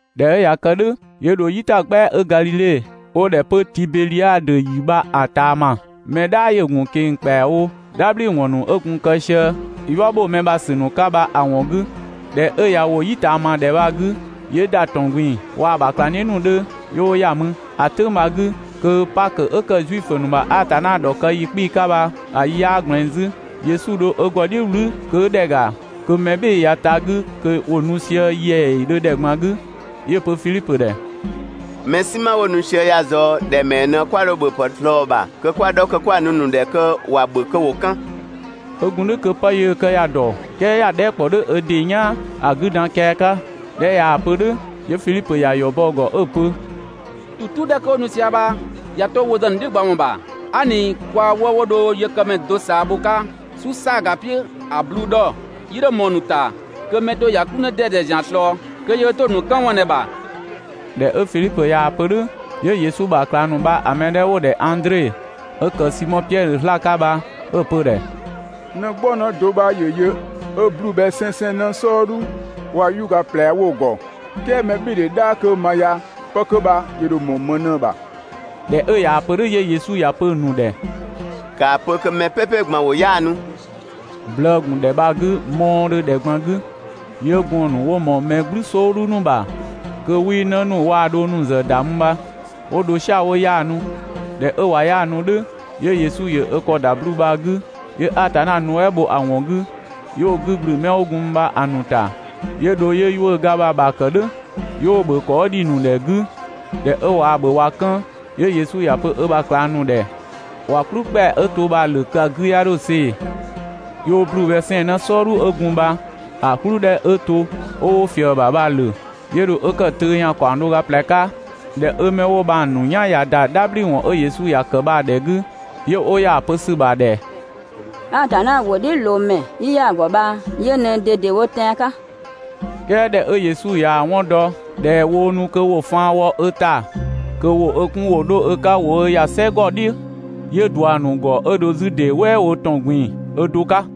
꞊Dhɛ 'ö ꞊ya kë "dhʋ̈ 'yö dho "yitagbɛa 'ö Gadhidhe 'wo‑ ‑dhɛ 'pö Tibedhiadö ‑yi bha‑ ꞊taama. Mɛ "dhaa ‑yö ‑gun ꞊keng‑ ‑kpɛawo "dhabhliwɔn ‑nu 'ö gun‑ kë sië "yua ‑bho mɛ ‑bha ‑sü ‑nu 'ka bha‑ ‑wɔn 'gü. ꞊Dhɛ 'ö ꞊ya ‑wo "yi ꞊taama ‑dhɛ bha‑ 'gü, 'yö ‑da ‑tɔn ꞊gbin‑ waa‑ ‑bha ꞊klangdhiʋ̈ ‑nu 'dhö 'yö 'wo ‑ya mü. ‑A "tʋ̈ng bha‑ 'gü kö Pakö 'ö ‑kë Zuifö ‑nu ‑bha Atanna ‑dhɔkë ‑yi 'kpii‑ 'ka bha‑ yi 'yaa ꞊gblɛɛn 'zü. Yesu dho ö ‑gɔ "dhiʋ̈ "wlü kö 'ö ‑dhɛ ‑ga, kö mɛ "bhɩɩ‑ ꞊ya ta‑ 'gü kö ‑wo nu sië ‑yɛɛdhö ‑dhɛ ꞊gban 'gü. 'Yö‑ pö Fidhipö ‑dhɛ: «Mɛ "sinma 'wo nu sië ya ꞊zɔɔ ‑dhɛ ‑mɛɛ ꞊në 'kwa dho ‑bhöpë ꞊slɔɔ‑ ‑bha kö 'kwa‑ 'dhɔ kö 'kwa‑ nu‑ ‑nu ‑dhɛ kö ‑wa ‑bhö kö ‑wo 'kën?» 'Ö gun "dhʋ̈ kö 'pë yöö‑ kë ‑ya ‑dɔ, "kɛɛ ‑ya dhɛɛ" ‑kpɔ "dhʋ̈ ö ‑dɩ "yaan ‑a 'gü dan kian 'ka. ꞊Dhɛ 'ö ꞊yaa‑ pö "dhʋ̈, 'yö Fidhipö ‑ya ‑yɔ bɔ‑ ‑gɔ 'ö‑ pö: «‑Tu "tu 'dhɛ kö 'wo nu sië bha ꞊ya 'to wo ‑zë ‑nu "dhiʋ̈ gba ‑wɔn ‑bha, aa" ꞊ni kwaa 'wëë‑ 'wo dho yëkëmɛ do ꞊saa bho‑ 'ka "su "saaga "piʋ̈ ‑a 'bluu‑ 'dhɔ, 'yii 'dho ꞊mɔɔ‑ ‑nu ‑ta kö mɛ do ‑ya "kplü 'në 'dɛdɛ ‑zian ꞊slɔɔ (kö yöö 'to‑ ‑nu 'kën ‑wɔn ꞊në‑ ‑bha).» ꞊Dhɛ 'ö Fidhipö ꞊yaa‑ pö "dhʋ̈, 'yö Yesu ‑bha ꞊klang ‑nu bha‑ mɛ 'dhɛ 'wo‑ ‑dhɛ Andre 'ö ‑kë Simɔ Piɛdhö 'zlaa‑ 'ka bha 'ö‑ pö‑ ‑dhɛ: «'Në "gbɔng 'në do 'bha ‑yö yö 'ö 'bluu‑ bhɛ 'sɛnsɛn 'në "sɔɔdhu waa‑ 'yuʋ̈ga ꞊plɛ 'wo‑ ‑gɔ, "kɛɛ mɛbhɩɩdhe "dhaa 'kö ma ya 'pë 'kö bha ‑yö ‑dho ꞊mɔɔ ‑më ꞊në‑ ‑bha?» ꞊Dhɛ 'ö ꞊yaa‑ pö "dhʋ̈ 'yö Yesu ‑ya pö‑ ‑nu ‑dhɛ: «‑Kaa pö kö mɛ ꞊gban "pɛpɛ ‑wo 'yaanu!» Blëë‑ ‑gun ‑dhɛ bha‑ 'gü mɔɔdhö ‑dhɛ ꞊gban 'gü. 'Yö gɔɔn‑ ‑nu 'wo ꞊mɔɔ mɛ "gblʋ̈ "sɔɔdhu ‑nu ‑bha, (kö 'wii 'në ‑nu waa‑ dhong ‑nu ‑zë ‑da mü bha) 'wo dho "sia‑ 'wo 'yaanu. ꞊Dhɛ 'ö ꞊wa 'yaanu "dhʋ̈, 'yö Yesu ‑yö ö ‑kɔ ‑da 'bluu‑ bha‑ 'gü 'yö Atanna nuɛ" bho‑ ‑wɔn 'gü, 'yö 'wo‑ 'gü ‑gblü 'mɛ 'wo gun mü bha‑ ‑nu ‑ta. 'Yö dho 'yö 'yuʋ̈ga bha‑ ‑bha ‑kë "dhʋ̈, 'yö 'wo‑ ‑bhö ‑kɔ 'ö ‑dhi ‑nu ‑dhɛ 'gü. ꞊Dhɛ 'ö ꞊waa‑ ‑bhö ꞊wa 'kën, 'yö Yesu ‑ya pö ö ‑bha ꞊klang ‑nu ‑dhɛ ‑wa "kplü ‑kpɛa 'ö to bha‑ ‑wlö kö‑ 'gü 'ya 'dho see‑. 'Yö 'wo 'bluu‑ bhɛ 'sɛnsɛn 'në "sɔɔdhu 'ö gun bha‑ "kplü 'dhɛ 'ö to 'ö 'wo ꞊fië‑ ‑bha bha‑ ‑wlö, 'yö dho 'ö ‑kë töö ‑yan ‑kaɔng do ga ꞊plɛ 'ka. ꞊Dhɛ 'ö 'mɛ 'wo bha‑ ‑nu "yan ꞊ya ‑da "dhabhliwɔn 'ö Yesu ‑ya kë bha‑ ‑dhɛ 'gü, 'yö 'wo ‑ya ‑a pö ‑sü ‑bha ꞊dhɛ: «Atanna ‑wʋdhiʋ̈loomɛ 'yi ‑ya ‑gɔ bha yö ꞊nɛ ꞊dedewo tɛan‑ 'ka!» "Kɛɛ ꞊dhɛ 'ö Yesu ꞊yaa‑ 'wɔn dɔ ꞊dhɛ woo nu kö wo faan wɔ ö ‑ta kö ‑wo ö 'kun ‑wo 'dho ö 'ka ‑wo ö ‑ya "sɛgɔ "dhiʋ̈, 'yö ꞊dua‑ ‑nu ‑gɔ 'ö dho 'zü ‑dee "wɛɛ wo ‑tɔn ꞊gbin‑ ö do 'ka.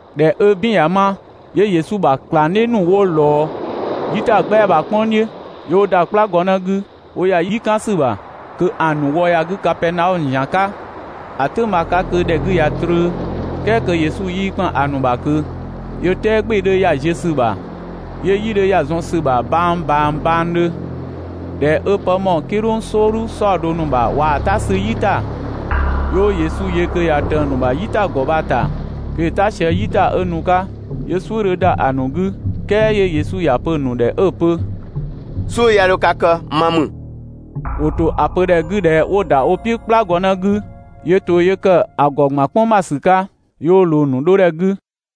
꞊Dhɛ 'ö "bin ꞊ya 'ma, 'yö Yesu ‑bha ꞊klangdhiʋ̈ ‑nu 'wo ꞊lɔɔ "yitagbɛa bha‑ "kpʋng "dhiʋ̈. 'Yö 'wo ‑da "kplagɔnë 'gü 'wo ‑ya "yi "kan ‑sü ‑bha kö ‑a ‑nu wë ‑ya 'gü Kapɛɛnaɔmö ‑zian 'ka. ‑A "tʋ̈ng bha‑ 'ka kö ‑dhɛ 'gü ꞊ya trö "kɛɛ kö Yesu 'yii ‑kpan ‑a ‑nu ‑bha ꞊kö. 'Yö "tɛɛ "gbɩɩ‑ 'dhö ‑ya ‑ziö ‑sü ‑bha, 'yö "yi 'dhö ‑ya zɔn ‑sü ‑bha bang ꞊bang bangdhö. ꞊Dhɛ 'ö 'pë 'ö ꞊mɔɔ "kidhʋng "sɔɔdhu "saɔdo ‑nu ‑bha waa‑ "ta 'sü "yi ‑ta, 'yö 'wo Yesu yö kö ꞊ya ꞊tëng‑ ‑nu ‑bha "yitagɔ bha‑ ‑ta kö ‑yö "ta sië "yi ‑ta 'ö nu‑ 'ka. 'Yö "suʋ̈ 'dhö ‑da ‑a ‑nu 'gü, "kɛɛ 'yö Yesu ‑ya pö‑ ‑nu ‑dhɛ 'ö‑ pö: «"Suʋ̈ 'ya 'dho ka kë, ma ‑mü!» ‑Wo ‑to ‑a pö ‑dhɛ 'gü ꞊dhɛ 'wo‑ ‑da wo "piʋ̈ "kplagɔnë 'gü 'yö to 'yö ‑kë ‑a ‑gɔ ‑gban "kpʋng ‑bha ‑sü 'ka, 'yö 'wo ꞊loo‑ ‑nu 'dhodhɛ 'gü.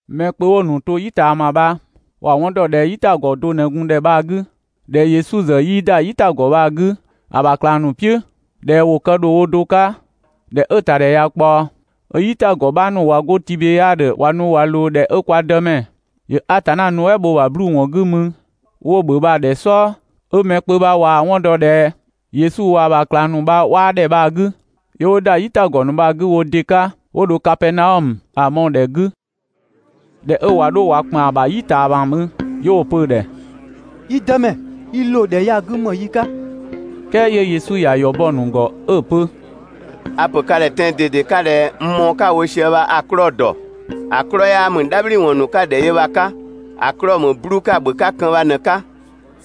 Mɛ kpö 'wo‑ ‑nu to "yi ꞊taama bha ‑wa 'wɔn ‑dɔ ꞊dhɛ "yitagɔ do ꞊në gun ‑dhɛ bha‑ 'gü. ꞊Dhɛ Yesu ‑zë 'yii ‑da "yitagɔ bha‑ 'gü ‑a ‑bha ꞊klang ‑nu "piʋ̈, ꞊dhɛ ‑wo kë ‑dho wo do 'ka. ꞊Dhɛ 'ö‑ ‑ta ‑dhɛ ꞊ya ꞊kpaɔ, 'ö "yitagɔ 'bha ‑nu ꞊wa 'go Tibedhiadö ꞊wa nu ꞊wa ꞊loo ‑dhɛ 'ö kwa Dëmɛ ‑yö Atanna nuɛ" bho 'bluu‑ ‑wɔn 'gü mü 'wo‑ ‑bhö bha‑ ‑dhɛ "sɔɔ, 'ö mɛ kpö bha ꞊waa‑ 'wɔn dɔ ꞊dhɛ Yesu waa‑ ‑bha ꞊klang ‑nu 'bha 'waa ‑dhɛ bha‑ 'gü, 'yö 'wo ‑da "yitagɔ ‑nu bha‑ 'gü wo ‑dɩ 'ka 'wo dho Kapɛɛnaɔmö, ‑a mɔɔ‑ ‑dhɛ 'gü. ꞊Dhɛ 'ö ꞊wa 'dho ꞊wa ‑kpan ‑bha "yi ꞊taama mü, 'yö 'wo‑ pö‑ ‑dhɛ: «Yi Dëmɛ, i ‑loo ‑dhɛ ya‑ 'gü ‑më yi 'ka?» "Kɛɛ 'yö Yesu ‑ya ‑yɔ bɔ‑ ‑nu ‑gɔ 'ö‑ pö: «A‑ pö ka ‑dhɛ tɛan‑ ꞊dede 'ka ꞊dhɛ n mɔɔ‑ 'ka‑ wo sië bha a‑ 'klɔɔ‑ ‑dɔ. ‑A 'klɔɔ‑ 'yaa ‑mü "dhabhliwɔn ‑nu 'ka‑ ‑dhɛ yö bha‑ 'ka, ‑a 'klɔɔ‑ ‑mü 'bluu‑ 'ka‑ ‑bhö 'ka kën bha ꞊në‑ 'ka.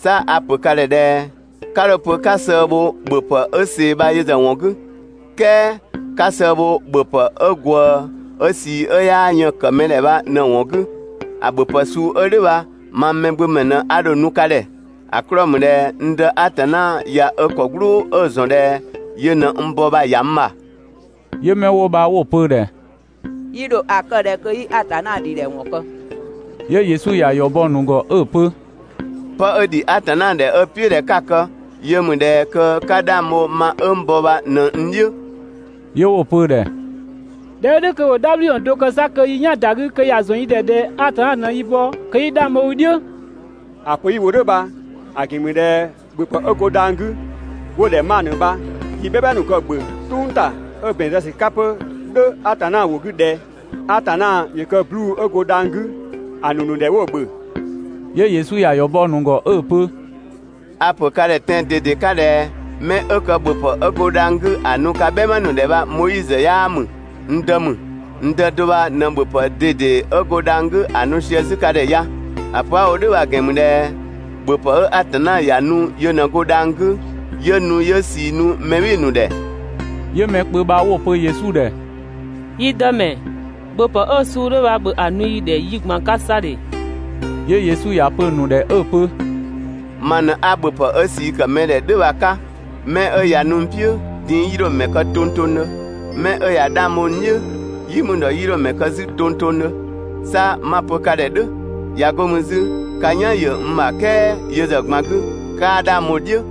'Sa a‑ ‑pö ka ‑dhɛ ꞊dhɛ: 'Ka 'dho‑ pö 'ka sëë bho ‑bhöpë 'ö ꞊see bha yö ‑zë ‑wɔn 'gü, "kɛɛ 'ka sëë bho ‑bhöpë 'ö ꞊gwëë, 'ö ꞊sii 'ö 'yaa yën‑ ‑kë mɛ ‑dhɛ bha ꞊në‑ ‑wɔn 'gü. ‑A ‑bhöpë suu 'ö "dhʋ̈ bha mang Mɛgbömɛ ꞊në 'a dho‑ nu ka ‑dhɛ. ‑A 'klɔɔ‑ ‑mü ꞊dhɛ n Dë Atanna ꞊ya ö ‑kɔ "gblʋʋ 'ö‑ ‑zɔn ꞊dhɛ yö ꞊në n bɔ bha‑ ‑ya n ‑bha.» 'Yö 'mɛ 'wo bha 'wo‑ pö‑ ‑dhɛ: «Yi ‑dho ‑a kë ꞊dhɛ kö 'yi Atanna ‑dhidhɛ ‑wɔn kë?» 'Yö Yesu ‑ya ‑yɔ bɔ‑ ‑nu ‑gɔ 'ö‑ pö: «'Pë 'ö ‑dhi Atanna ‑dhɛ 'ö‑ "piʋ̈ ꞊dhɛ 'ka‑ kë yö ‑mü ꞊dhɛ kö 'ka 'dhang bho ma 'ö n bɔ bha ꞊në n "dhiʋ̈.» 'Yö 'wo‑ pö‑ ‑dhɛ: «꞊Dhɛ 'ö "dhʋ̈ kö ‑bhö "dhabhliwɔn do kë 'sa kö yi "yan‑ ‑da 'gü kö ‑ya ‑zɔn yi ‑dhɛ ꞊dhɛ Atanna ꞊në i bɔ, kö 'yi 'dhang bho i "dhiʋ̈.» ‑A pö 'yi‑ wo "dhʋ̈ bha‑ ‑gɛn ‑mü ꞊dhɛ ‑bhöpë 'ö go dhang‑ 'gü, 'wo‑ ‑dhɛ manö bha, yi "bhɛma ‑nu kë‑ ‑bhö "tʋng ‑ta 'ö ‑bɛn zë ‑sü 'ka 'pö "dhʋ̈ Atanna ‑wʋ 'gü ꞊dhɛ: ‹Atanna ‑yö kë 'bluu‑ 'ö go dhang‑ 'gü ‑a ‑nu ‑nu ‑dhɛ 'wo‑ ‑bhö›. 'Yö Yesu ‑ya ‑yɔ bɔ‑ ‑nu ‑gɔ 'ö‑ pö: «A‑ ‑pö ka ‑dhɛ tɛan‑ ꞊dede 'ka ꞊dhɛ: 'Mɛ 'ö kë ‑bhöpë 'ö go dhang‑ 'gü ‑a ‑nu ka "bhɛma ‑nu ‑dhɛ bha Moizö 'yaa ‑mü, n Dë ‑mü. N Dë do bha ꞊në ‑bhöpë ꞊dede 'ö go dhang‑ 'gü ‑a nu sië 'zü ka ‑dhɛ ya. ‑A pö 'a‑ wo "dhʋ̈ bha‑ ‑gɛn ‑mü ꞊dhɛ ‑bhöpë 'ö Atanna ‑ya nu yö ꞊në go dhang‑ 'gü 'yö nu 'yö ꞊sii nu mɛ "bhɩɩ‑ ‑nu ‑dhɛ.» 'Yö mɛ kpö bha 'wo‑ pö Yesu ‑dhɛ: «Yi Dëmɛ, ‑bhöpë 'ö suu 'dhö bha ‑bhö ‑a nu yi ‑dhɛ yi ꞊gban 'ka 'sa ‑dhe!» 'Yö Yesu ‑ya pö‑ ‑nu ‑dhɛ 'ö‑ pö: «Ma ꞊në 'a ‑bhöpë 'ö ꞊sii ‑kë mɛ ‑dhɛ "dhʋ̈ bha‑ 'ka. 'Mɛ 'ö ꞊ya nu n "piʋ̈, din‑ 'yii 'dho‑ ‑mɛ kë tongtongdhö. Mɛ 'ö ꞊ya 'dhang bho n "dhiʋ̈, "yi mü ‑dhɔ 'yii 'dho‑ mɛ kë 'zü tongtongdhö. 'Sa 'ma‑ pö ka ‑dhɛ "dhʋ̈, ꞊ya 'go mü 'zü ka "yan ‑yö n ‑bha "kɛɛ yö ‑zë ꞊gban 'gü 'kaa 'dhang bho‑ "dhiʋ̈.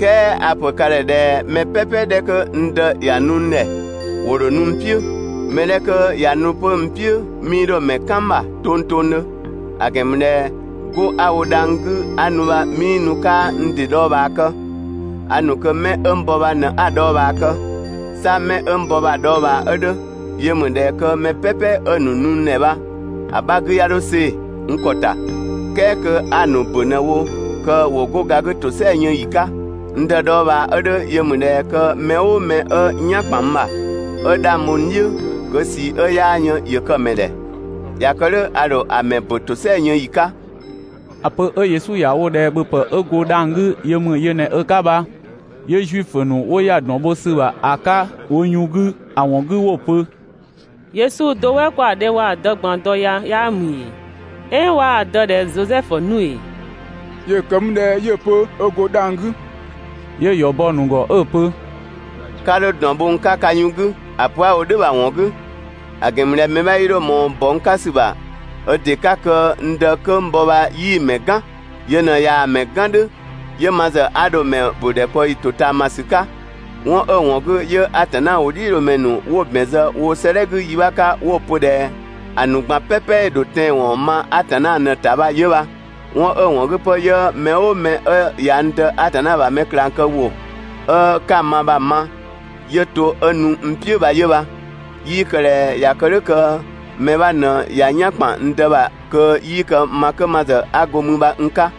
"Kɛɛ a‑ pö ka ‑dhɛ ꞊dhɛ mɛ "pɛpɛ 'dhɛ 'kö n Dë ‑ya nu n ‑dhɛ, ‑wo ‑dho nu n "piʋ̈. Mɛ 'dhɛ 'kö ꞊ya nu 'pö n "piʋ̈, 'mii 'dho‑ ‑mɛ "kan n ‑bha tongtongdhö. ‑A ‑gɛn ‑mü ꞊dhɛ 'go 'a‑ wo dhang‑ 'gü 'a nu bha 'mii nu 'kaa n ‑dɩ dhɔɔbhaa kë. A ‑nu kö 'mɛ 'ö n bɔ bha ꞊në 'a‑ dhɔɔbhaa kë. 'Sa 'mɛ 'ö n bɔ bha‑ dhɔɔbhaa 'ö 'dhö yö ‑mü ꞊dhɛ kö mɛ "pɛpɛ 'ö‑ nu n ‑dhɛ bha‑ 'bha 'gü 'ya 'dho see‑ n ‑kɔ ‑ta, "kɛɛ kö 'a‑ ‑nu ‑bö ꞊në‑ wo kö ‑wo 'go ga 'gü ‑tosɛa yën ‑yi 'ka. N Dë dhɔɔbhaa 'ö 'dhö yö ‑mü ꞊dhɛ kö mɛ "ʋʋ mɛ 'ö "yan ‑kpan n ‑bha, 'ö 'dhang bho n "dhiʋ̈, kö ꞊sii 'ö 'yaa yën ‑yö kë‑ ‑mɛ ‑dhɛ. ꞊Ya kë "dhʋ̈ a ‑dho ‑a ‑mɛ ‑bö ‑tosɛa yën ‑yi 'ka. ‑A pö 'ö Yesu ‑ya wo ꞊dhɛ ‑bhöpë 'ö go dhang‑ 'gü yö ‑mü yö ꞊në ö 'ka bha, 'yö Zuifö ‑nu 'wo ‑ya ‑dɔn bho ‑sü ‑bha ‑a 'ka wo yun 'gü ‑a ‑wɔn 'gü 'wo‑ pö: «Yesu do "wɛ 'kwa‑ dhe waa‑ dë ꞊gban dɔ ya 'yaa ‑mü ‑ee? "Ɛɛn 'waa‑ dë ‑dhɛ Zosɛfu 'nu ‑ee? ‑Yö kë mü ꞊dhɛ 'yö‑ pö ö ‑go dhang‑ 'gü?» 'Yö‑ ‑yɔ bɔ‑ ‑nu ‑gɔ 'ö‑ pö: «'Ka 'dho ‑dɔn bho n 'ka ka yun 'gü ‑a pö 'a‑ wo "dhʋ̈ bha‑ ‑wɔn 'gü, ‑a ‑gɛn ‑mü ꞊dhɛ mɛ 'bha 'yii 'dho ꞊mɔɔ ‑bɔ n 'ka ‑sü ‑bha ö ‑dɩ 'ka kö n Dë 'kö n bɔ bha 'yii‑ ‑mɛ "gan. Yö ꞊në ꞊yaa‑ ‑mɛ "gan "dhʋ̈, 'yö ma ‑zë 'a dho‑ ‑mɛ ‑bö ‑dhɛkpaɔyi ‑totaamasü 'ka. 'Wɔn 'ö‑ ‑wɔn 'gü 'yö Atanna ‑wʋdhiʋ̈loomɛ ‑nu 'wo‑ ‑bɛn zë woo‑ 'sëëdhɛ 'gü yi 'bha 'ka 'wo‑ pö ꞊dhɛ: ‹‑A ‑nu ꞊gban "pɛpɛ‑ ‑dho tɛanwɔn ma Atanna ꞊në‑ ‑ta› bha 'yö bha. 'Wɔn 'ö‑ ‑wɔn 'gü 'pö 'yö mɛ "ʋʋ mɛ 'ö ꞊ya n Dë Atanna ‑bha mɛ ꞊klangkëwʋ ('ö 'ka‑ ma bha‑) ma, 'yö to 'ö nu n "piʋ̈ bha 'yö bha. 'Yii kë ꞊dhɛ ꞊ya kë "dhʋ̈ kö mɛ 'bha ꞊në ꞊ya "yan ‑kpan n Dë ‑bha kö 'yii kë ma 'kö ma ‑zë 'a go mü bha n 'ka.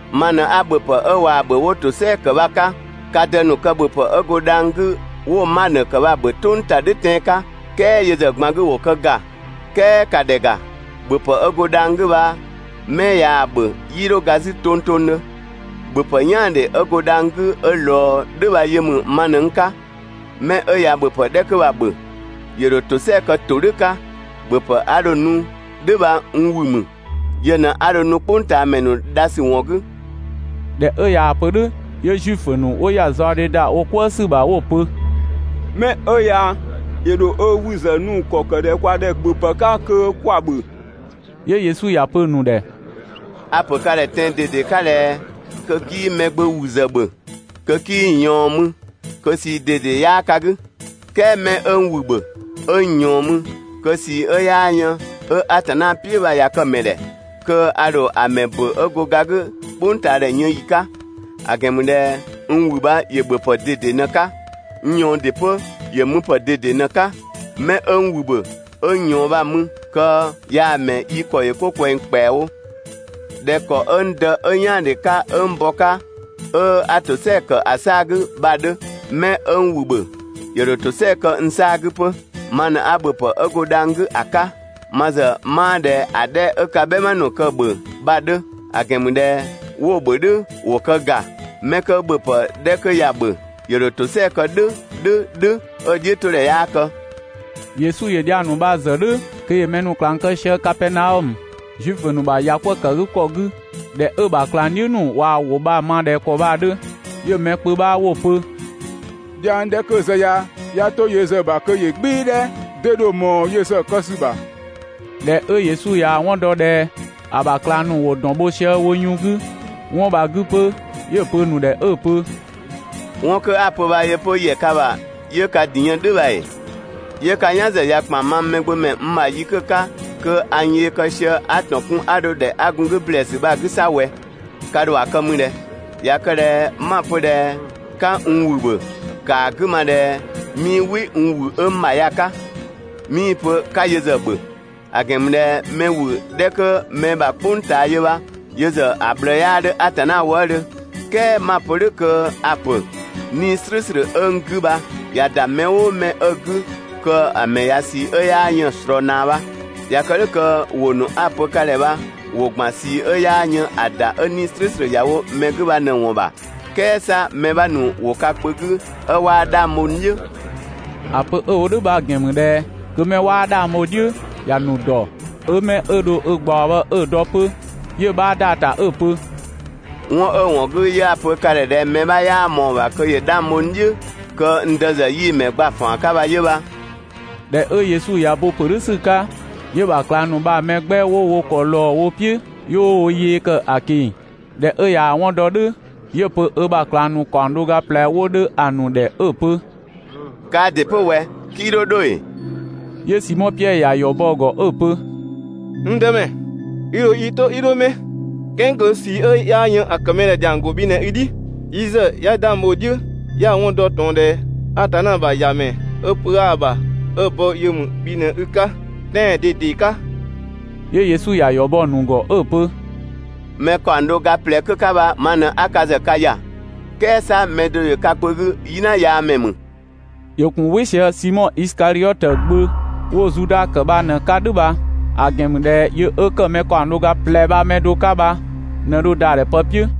Ma ꞊në 'a ‑bhöpë 'ö ꞊waa‑ ‑bhö 'wo ‑tosɛa ‑kë bha‑ 'ka. Ka dë ‑nu kë ‑bhöpë 'ö go dhang‑ 'gü 'wo‑ manö ‑kë bha‑ ‑bhö "tʋng ‑ta "dhʋ̈ tɛan‑ 'ka "kɛɛ yö ‑zë ꞊gban 'gü ‑wo kë ‑ga. "Kɛɛ ‑ka ‑dhɛ ‑ga, ‑bhöpë 'ö go dhang‑ 'gü bha 'mɛ ꞊yaa‑ ‑bhö 'yii 'dho ga 'zü tongtongdhö. ‑Bhöpë "yaandhe 'ö go dhang‑ 'gü 'ö ꞊lɔɔ "dhʋ̈ bha yö ‑mü ma ꞊në n 'ka. 'Mɛ 'ö ꞊ya ‑bhöpë 'dhɛ 'kö bha‑ ‑bhö, ‑yö ‑dho ‑tosɛa kë ‑todhʋ̈ 'ka. ‑Bhöpë 'a dho‑ nu "dhʋ̈ bha n ‑wü ‑mü. Yö ꞊në 'a dho‑ nu "kpʋngtaamɛ ‑nu dha ‑sü ‑wɔn 'gü.» ꞊Dhɛ 'ö ꞊yaa‑ pö "dhʋ̈ 'yö Zuifö ‑nu 'wo ‑ya zaɔdhe ‑da wo "kwëë ‑sü ‑bha 'wo‑ pö: «'Mɛ 'ö ya ‑yö ‑dho ö ‑wü ‑zë nu ‑kɔ kë ꞊dhɛ kwa ‑dhɛ ‑bhöpë 'ka kö 'kwa‑ ‑bhö?» 'Yö Yesu ‑ya pö‑ ‑nu ‑dhɛ: «A‑ ‑pö ka ‑dhɛ tɛan‑ ꞊dede 'ka ꞊dhɛ ꞊ya kë ꞊dhɛ kö 'kii Mɛgbömɛ ‑wü ‑zë ‑bhö, kö 'kii‑ ꞊yɔɔn mü, kö ꞊sii ꞊dede 'yaa ka 'gü. "Kɛɛ mɛ 'ö n ‑wü ‑bhö 'ö n ꞊yɔɔn mü, kö ꞊sii 'ö 'yaa yën 'ö Atanna "piʋ̈ bha ꞊ya kë‑ ‑mɛ ‑dhɛ, kö a ‑dho ‑a ‑mɛ ‑bö 'ö go ga 'gü "kpʋngtaadhɛ yën ‑yi 'ka. ‑A ‑gɛn ‑mü ꞊dhɛ n ‑wü bha ‑yö ‑bhöpë ꞊dede ꞊në‑ 'ka. N ꞊yɔɔn ‑dɩ 'pö, ‑yö müpë ꞊dede ꞊në‑ 'ka. 'Mɛ 'ö n ‑wü ‑bhö, 'ö n ꞊yɔɔn bha‑ mü kö yaa‑ ‑mɛ yi ‑kɔ ‑yö 'ko ꞊kwɛng ‑kpɛawo, ꞊dhɛ ‑kɔ 'ö n Dë 'ö "yaandhe 'ka 'ö n bɔ‑ 'ka 'ö 'a ‑tosɛa ‑kë ‑a 'saa‑ 'gü bha‑ 'dhö. 'Mɛ 'ö n ‑wü ‑bhö, ‑yö ‑dho ‑tosɛa kë n 'saa‑ 'gü 'pö. Ma ꞊në 'a ‑bhöpë 'ö go dhang‑ 'gü ‑a 'ka, ma ‑zë 'maa ꞊dhɛ ‑a 'dhɛ 'ö ka "bhɛma ‑nu kë‑ ‑bhö bha‑ 'dhö. ‑A ‑gɛn ‑mü ꞊dhɛ ꞊dhɛ 'wo‑ ‑bhö "dhʋ̈, wo kë ‑ga. 'Mɛ 'kö ‑bhöpë 'dhɛ 'kö ya‑ ‑bhö, ‑yö ‑dho ‑tosɛa kë "dhʋ̈ "dhʋ̈ "dhʋ̈ 'ö‑ "dhiʋ̈ 'to ‑dhɛ 'yaa kë.» Yesu ‑yö dhiang ‑nu bha‑ zë "dhʋ̈ kö ‑yö mɛ ‑nu ꞊klang kë sië Kapɛɛnaɔmö, Zuifö ‑nu ‑bha ‑yakwëëkëgükɔ 'gü. ꞊Dhɛ 'ö‑ ‑bha ꞊klangdhiʋ̈ ‑nu ꞊wa ‑wʋ bha‑ ma ꞊dhɛ ‑kɔ bha‑ 'dhö, 'yö‑ mɛ kpö 'bha 'wo‑ pö: «Dhiang 'dhɛ 'kö‑ zë ya, ꞊ya 'to yö ‑zë ‑bha kö ‑yö "gbɩɩ‑ "dhɛ! 'Dee dho ꞊mɔɔ yö ‑zë kë ‑sü ‑bha?» ꞊Dhɛ 'ö Yesu ꞊yaa‑ 'wɔn dɔ ꞊dhɛ ‑a ‑bha ꞊klang ‑nu ‑wo ‑dɔn bho sië wo yun 'gü 'wɔn bha‑ 'gü 'pö, 'yö‑ pö‑ ‑nu ‑dhɛ 'ö‑ pö: «'Wɔn 'kö 'a‑ pö bha yö 'pö ‑yɛ ka ‑bha 'yö ka ‑din yën "dhʋ̈ bha ‑ee? 'Yö 'ka "yan ‑zë ‑kpan mang Mɛgbömɛ n ‑bha yi 'kö‑ 'ka kö a n yee kë sië 'a ‑tɔn kun 'a dho ‑dhɛ 'a gun‑ 'gü ‑blɛɛsü bha‑ 'gü 'sa ꞊wɛ! Ka ‑dho ‑a kë mü ꞊dhɛ? ꞊Ya kë ꞊dhɛ 'ma‑ pö ꞊dhɛ 'ka n ‑wü ‑bhö, ‑kaa 'gü ma ꞊dhɛ 'mii "wɩ n ‑wü 'ö n ‑bha ya‑ 'ka, 'mii‑ pö 'ka yö ‑zë ‑bhö. ‑A ‑gɛn ‑mü ꞊dhɛ mɛ ‑wü 'dhɛ kö mɛ ‑bha "kpʋng ꞊taa yö bha yö ‑zë ꞊bhlëë 'yaa 'dhö Atanna wëëdhö, "kɛɛ 'ma‑ pö "dhʋ̈ kö a‑ ‑pö: 'Nii‑ "slʋ̈ʋ̈slʋ̈ 'ö n 'gü bha ꞊ya ‑da mɛ "ʋʋ mɛ 'ö‑ 'gü kö‑ ‑mɛ ꞊ya ꞊sii 'ö 'yaa yën‑ ꞊slɔɔ ꞊naa bha. ꞊Ya kë "dhʋ̈ kö ‑wʋ ‑nu 'a‑ pö ka ‑dhɛ bha ‑wo ‑gban ꞊sii 'ö 'yaa yën ‑a ‑da 'ö 'Nii‑ "slʋ̈ʋ̈slʋ̈ ‑ya wo mɛ 'gü bha ꞊në ‑wɔn ‑bha. "Kɛɛ 'sa mɛ 'bha ‑nu ‑wo ka kpö 'gü 'ö 'waa 'dhang bho n "dhiʋ̈.» ‑A pö 'ö‑ wo "dhʋ̈ bha‑ ‑gɛn ‑mü ꞊dhɛ kö 'mɛ 'waa 'dhang bho‑ "dhiʋ̈ bha ‑ya ‑nu ‑dɔ, 'ö 'mɛ 'ö dho‑ ꞊gbaɔ bha 'ö‑ dɔ 'pö. 'Yö‑ 'bha ‑da ‑ta 'ö‑ pö: «'Wɔn 'ö ‑wɔn 'gü 'yö 'a‑ pö ka ‑dhɛ ꞊dhɛ mɛ 'bha 'yaa ꞊mɔɔ‑ ‑bha kö ‑yö 'dhang bho n "dhiʋ̈ kö n Dë ‑zë 'yii‑ ‑mɛ gba‑ ‑faan 'ka bha 'yö bha. ꞊Dhɛ 'ö Yesu ꞊ya bo‑ ‑pö "dhʋ̈ ‑sü 'ka 'yö‑ ‑bha ꞊klang ‑nu bha‑ mɛ 'gbɛ 'wo wo ‑kɔ ꞊lɔɔ wo "piʋ̈, 'yö 'wo wo yee ‑kë ꞊keng‑. ꞊Dhɛ 'ö ꞊yaa‑ 'wɔn dɔ "dhʋ̈ 'yö‑ pö ö ‑bha ꞊klang ‑nu ‑kaɔng do ga ꞊plɛ 'wo 'dhö ‑a ‑nu ‑dhɛ 'ö‑ pö: «Kaa ‑dɩ 'pö ꞊wɛ, 'kii 'dho 'dho ‑ee?» 'Yö Simɔ Piɛdhö ‑ya ‑yɔ bɔ‑ ‑gɔ 'ö‑ pö: «N Dëmɛ, yi ‑dho i 'to yi dho 'mɛ, "kɛɛ kö ꞊sii 'ö 'yaa yën ‑a ‑kë mɛ ‑dhɛ ‑dhiang ‑go bhi ꞊në i "dhi! Yi ‑zë 'ya 'dhang bho‑ "dhiʋ̈ 'ya‑ 'wɔn ‑dɔ ꞊tɔn ꞊dhɛ Atanna ‑bha ‑Yamɛ 'ö pö 'aa‑ ‑bha 'ö‑ bɔ yö ‑mü bhi ꞊në i 'ka tɛan‑ ꞊dede 'ka!» 'Yö Yesu ‑ya ‑yɔ bɔ‑ ‑nu ‑gɔ 'ö‑ pö: «Mɛ ‑kaɔng do ga ꞊plɛ 'kö 'ka bha ma ꞊në 'a ka ‑zë ka ‑ya, "kɛɛ 'sa mɛ do ‑yö ka kpö 'gü "yina yaa ‑mɛ ‑mü!» ‑Yö ‑gun "wɩ sië Simɔ Isikadhiɔtö gbö 'wo Zuda ‑kë bha ꞊në‑ 'ka "dhʋ̈ bha, ‑a ‑gɛn ‑mü ꞊dhɛ yö 'ö ‑kë mɛ ‑kaɔng do ga ꞊plɛ bha‑ mɛ do 'ka bha ꞊nɛ dho ‑da ‑dhɛ pë "piʋ̈.